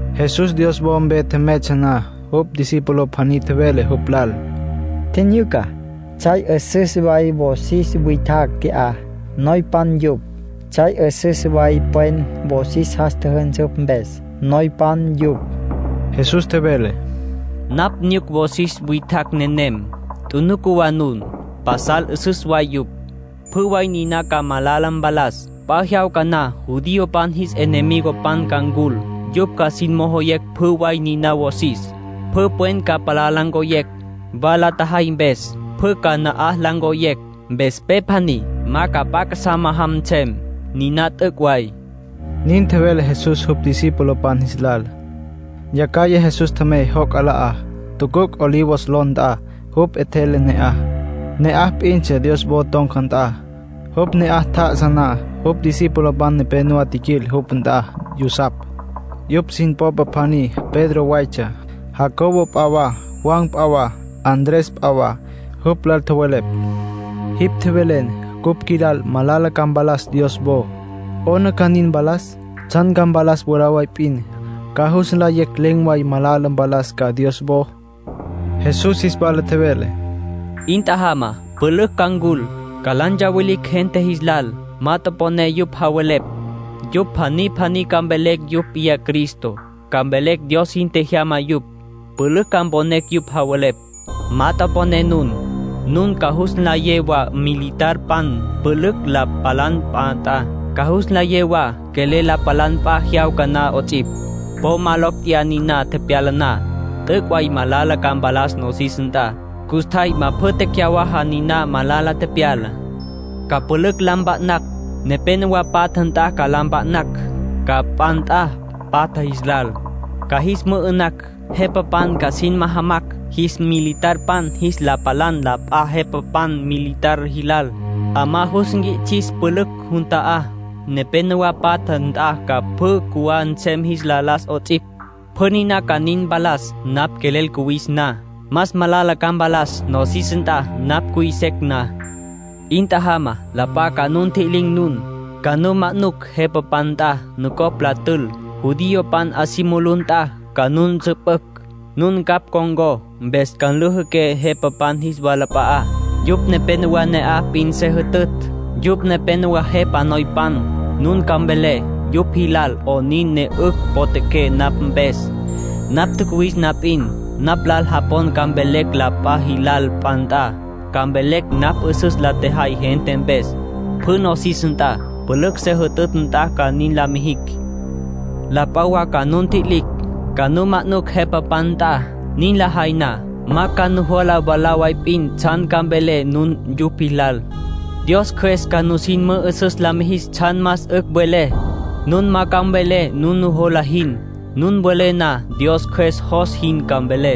Jesús Dios wo mpe tjemeytsja na, jupj discípulo pjaní tjevele jupj lal: —Tjinyuca. Tsjay 'üsüs way wosis witjacj qui'á. Noypan yupj. Tsjay 'üsüs way pwen wosis jas tjüjünsüpj mpes, noypan yupj. Jesús tjevele: —Napj nyuc wosis witjacj nenem. Tjunuca wa nun. Pasal 'üsüs way yupj. Pjü way niná ca malala mpalas. P'a jyawca na judiopan jis enemigopan ca ncul. Yupj ca sin mojoyecj pjü way niná wosis. Pjü pwen ca palá la ncoyecj, wa la tjajay mpes. Pjü ca na'aj la ncoyecj, mpes pe pjaní ma ca p'a casá ma'ajam nsem. Niná t'üc' way —nin tjevele Jesús jupj discipulopan jis lal. Yacjaya Jesús tjemey joc' 'ala'á, tucuc' Olivos ló nt'a. Jupj 'etjele ne'aj. Ne'aj p'intsja Dios wo ton̈ca nt'a. Jupj ne'aj tjá'asa na, jupj discipulopan nepénowa tjiquil jupj nt'a yusapj. Yupj sin popa pjaní Pedro waytsja, Jacobo p'a wa, Juan p'a wa, Andrés p'a wa. Jupj lal tjowelepj: —Jipj tjevelen cupj qjuilal malala ca mpalas Dios wo. ¿'Ona ca nin mpalas? ¿Tsjan ca mpalas mwalá way p'in, ca jus nlayecj len̈ way malala mpalas ca Dios wo? Jesús jis wala tjevele: —'In tjajama. Pülücj ca ncul, ca la ntsawilicj gente jis lal. Ma toponé yupj javelepj. Yupj pjaní pjaní ca mvelecj yupj p'iyá Cristo. Ca mvelecj Dios sin tjejyama yupj. Pülücj ca mponecj yupj javelepj. Po ma toponé nun. ”Nun ca jus nlayé wa militarpan pülücj la palan p'a nt'a. Ca jus nlayé wa quelel la palan p'a jyawca na 'ots'ipj. Po ma locj tjeyá niná tepyala na. T'üc' way malala ca mpalas nosis nt'a. Custjay ma pjü tecyawaja niná malala tepyalá. Ca pülücj la mpa'nacj. Nepénowa patja nt'a la mpa'nacj ca p'a nt'a patja jis lal. Ca jis mü'ü'nacj. Jepapan ca sin majamacj jis militarpan jis la palan la p'a jepapan militar jilal. 'Amá jus nquits'is pülücj jun ta'á. Nepénowa patja nt'a ca pjü cjuwá nsem jis la las 'ots'ipj. Pjü niná ca nin mpalas napj quelel cuwis na. Más malala ca mpalas nosis nt'a napj cuy secj na. ”'In tjajama. La p'a ca nu ntji'lin̈ nun. Ca nu manucj jepapan nt'a, nucopj la tül. Judiopan 'a si mulú nt'a ca nu nsüpücj. Nun ncapj con̈có, mpes ca nlüjüqué jepapan jis walap'a'á, yupj nepenowá ne'aj p'in se jütütj, yupj nepenowá jepa noypan. Nun ca mvelé yupj jilal 'onin ne 'ücj potjaqué napj mpes. Ma tjacuwis na p'in, napj lal japon ca mvelecj la p'a jilal p'a nt'a. Ca mvelecj napj 'üsüs la tjejay gente mpes. Pjü nosis nt'a, pülücj se jütütj nt'a ca nin la mijicj. ”La p'a wa ca nu ntji'lin̈, ca nu manucj jepapan nt'a. Nin lajay na, ma ca nujola mwalá way p'in tsjan ca mvelé nun yupj jilal. Dios Cjües ca nusin mü'üsüs la mijis tsjan más 'ücj mvelé. Nun ma ca mvelé nun nujola jin. Nun welé na, Dios Cjües jos jin ca mvelé.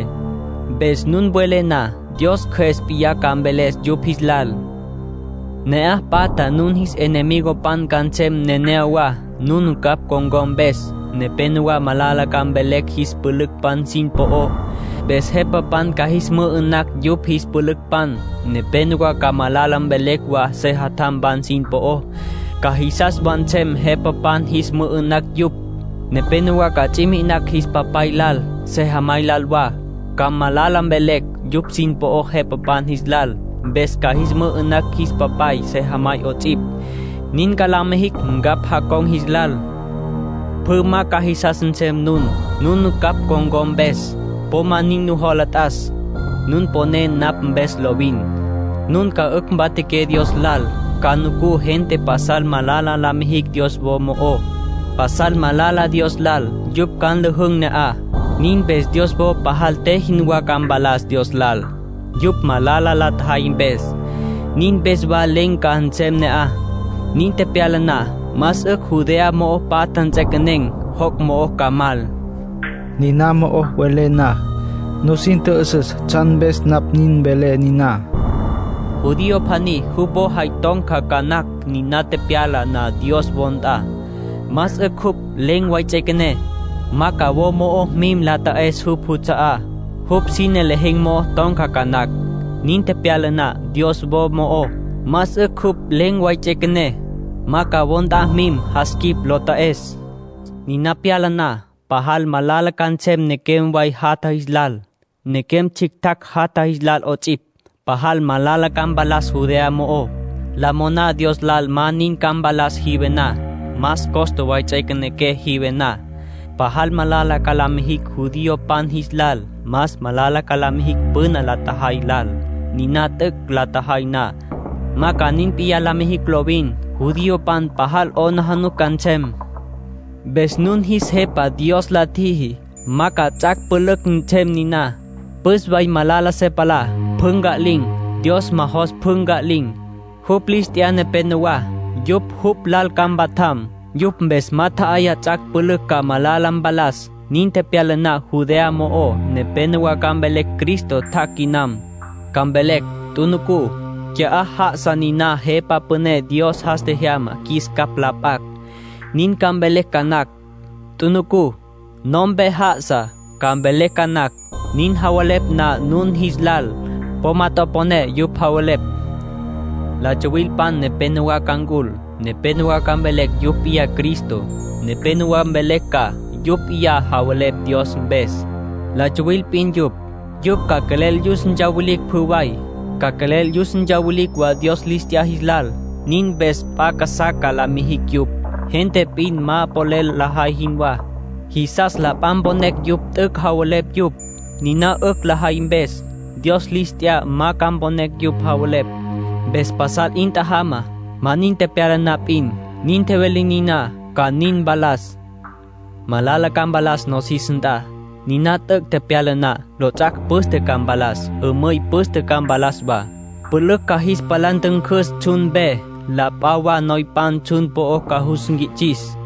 Mpes nun welé na, Dios Cjües p'iyá ca mveles yupj jis lal. ”Ne'aj patja nun jis enemigopan ca nsem neneyawá, nun ncapj con̈có mpes. Nepénowa malala ca mvelecj jis pülücpan sin po'ó, mpes jepapan ca jis mü'ü'nacj yupj jis pülücpan. Nepénowa ca malala mvelecj wa sejatjampan sin po'ó. Ca jisas wa nsem jepapan jis mü'ü'nacj yupj. Nepénowa ca ts'i mi'inacj jis papay lal, sejamay lal wa. Ca malala mvelecj yupj sin po'ó jepapan jis lal. Mpes ca jis mü'ü'nacj jis papay, sejamay 'ots'ipj. Nin ca la mijicj ncapj jacon̈ jis lal. Pjü ma ca jisas nsem nun, nun ncapj con̈có mpes. Po ma nin nujola t'as. Nun poné napj mpes lovin, nun ca 'ücj mpatjaqué Dios lal. ”Ca nucú gente pasal malala la mijicj Dios wo mo'ó. Pasal malala Dios lal yupj ca nlüjün̈ ne'aj. Nin mpes Dios wo pajal te jinwá ca mpalas Dios lal, yupj malala la tjajay mpes. Nin mpes wa len̈ ca nsem ne'aj. Nin tepyala na, más 'ücj Judea mo'o patja nts'equenen̈, joc' mo'o ca mal. (Niná mo'o welé na, nusin tjü'üsüs tsjan mpes napj nin velé niná.) Judío pjaní jupj wo jay ton̈ca ca nacj niná pyala na Dios wo nt'a. Más 'ücj jupj len̈ way ts'üequené. Ma ca wo mo'ó mim la ta'es jupj juts'a'á. Jupj sine lejen̈ mo'o ton̈ca ca nacj, niná pyala na Dios wo mo'ó. Más 'ücj jupj len̈ way ts'üequené. Ma ca wo nt'a mim jas quip lo ta'es. Niná pyala na, pajal malala ca nsem nequem way jatja jis lal, nequem tsjictjacj jatatj jis lal 'ots'ipj. Pajal malala ca mpalas Judea mo'ó. ”La moná Dios lal ma nin ca mpalas jive na. Más costa way ts'üequenequé jive na. Pajal malala ca la mijicj judiopan jis lal. Más malala ca la mijicj püna la tjajay lal. Niná t'üc' la tjajay na, ma ca nin p'iyá la mijicj lovin. Judiopan pajal 'aplijila ca nsem. Mpes nun jis Jepa Dios la tjiji ma ca ts'ac' pülücj nsem niná. Püs way malala se palá, pjü nca'lin̈. Dios ma jos pjü nca'lin̈. Jupj lis t'ya nepénowa, yupj jupj lal ca mpatjam. Yupj mpes ma tje'yaya ts'ac' pülücj ca malala mpalas. ”Nin tepyala na Judea mo'ó, nepénowa ca mvelecj Cristo tjac' quinam. Ca mvelecj: ‘Tjunucú. Qui'á já'asa niná Jepa Püné Dios jas tjejyama qjuis capj la p'acj.’ Nin ca mvelecj ca nacj. ‘Tjunucú. No'ompe já'asa’, ca mvelecj ca nacj. Nin javelepj na nun jis lal, po ma toponé yupj javelepj. La tsuwilpan nepénowa ca ncul. Nepénowa ca mvelecj yupj p'iyá Cristo. Nepénowa mvelecj ca yupj p'iyá javelepj Dios mpes. La tsuwil p'in yupj. Yupj ca quelel yus ntsawilicj pjü way. Ca quelel yus ntsawilicj wa Dios lis t'ya jis lal. Nin mpes p'a casá ca la mijicj yupj, gente p'in ma polel lajay jinwá. Jisas la p'a mponecj yupj t'üc' javelepj yupj, niná 'ücj lajay mpes. Dios lis t'ya ma ca mponecj yupj javelepj. Mpes pasal 'in tjajama. Ma nin tepyala na p'in, nin tjevelé niná ca nin mpalas. ”Malala ca mpalas nosis nt'a. Niná t'üc' tepyala na, lots'ac' püste ca mpalas. Mümüy püste ca mpalas wa. Pjulacj ca palá jis ntüncüs tsjun mpe. La p'a wa noypan tsjun po'ó ca jus nquits'is.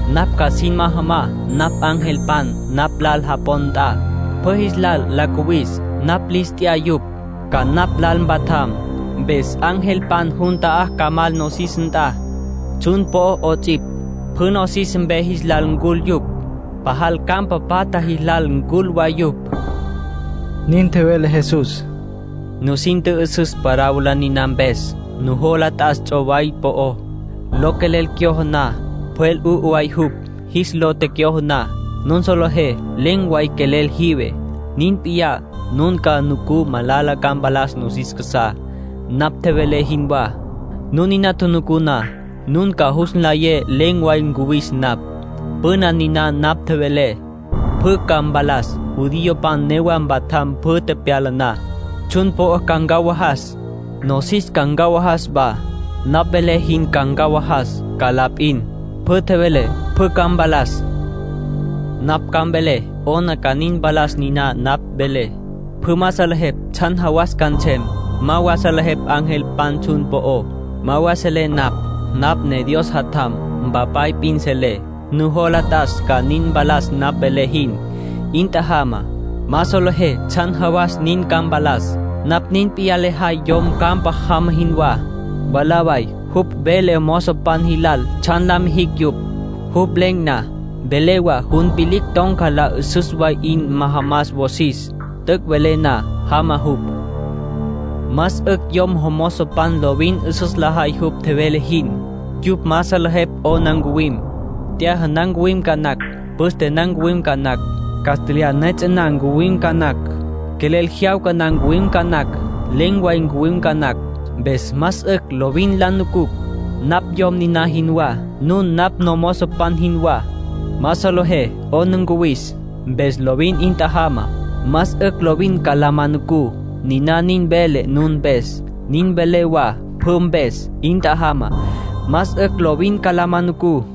Napj ca sin majam napj angelpan napj lal japon nt'a, pjü jis lal la cuwis. Napj lis t'ya yupj, ca napj lal mpatjam. Mpes angelpan jun ta'á ca mal nosis nt'a, tsjun po'ó 'ots'ipj. Pjü nosis mpe jis lal ncul yupj. Pajal campa patja jis lal ncul wa yupj —nin tjevele Jesús. —Nusin tjü'üsüs parábola niná mpes. Nujola t'as ts'oway po'ó. Lo quelel cyojo na, pjwel 'u'u way jupj. Jis lo tecyojo na, nun solejé len̈ way quelel jive. Nin p'iyá, nun ca nucú malala ca mpalas nosis casá, napj tjevelé jinwá. Nun niná tjunucú na, nun ca jus nlayé len̈ way ncuwis napj. Pjü niná napj tjevelé, pjü ca mpalas. Judiopan newa mpatjam pjü tepyala na. Tsjun po'ó ca ncawajas, nosis ca ncawajas wa. Napj velé jin ma ncawajas ca la p'in. Pjü tjevelé pjü ca mpalas. ”Napj ma ca mvelé 'ona ca nin mpalas niná napj velé. Pjü ma salejepj tsjan jawas ca nsem. Ma wa salejepj angelpan tsjun po'ó. Ma wa selé napj. Napj ne Dios Jatjam. Mpapay p'in selé. Nujola t'as ca nin mpalas napj tjevelé jin. 'In tjajamá. Ma solejé tsjan jawas nin ca mpalas. ”Napj nin p'iyá lejay yom campa jama jinwá. Mwalá way jupj vele jomozopan jilal tsjan la mijicj yupj, jupj len̈ na. Vele wa jun vilicj ton̈ca lal 'üsüs way 'in majamas wosis. T'üc' tjevele na, jama jupj. Más 'ücj yom jomozopan lovin 'üsüs lajay jupj tjevele jin. Yupj ma salejepj 'ona ncuwim. T'yaja na ncuwim ca nacj. Püste na ncuwim ca nacj. Castlyaj li piyú na ncuwim ca nacj. Quelel jyawca na ncuwim ca nacj. Len̈ way ncuwim ca nacj. Mpes más 'ücj lovin la nucucj. Napj yom niná jinwá. Nun napj nomozopan jinwá. Ma solejé 'ona ncuwis. Mpes lovin 'in tjajamá. Más 'ücj lovin ca la ma nucú. Niná nin velé nun mpes, nin velé wa pjü mpes. 'In tjajama. Más 'ücj lovin ca la ma nucú.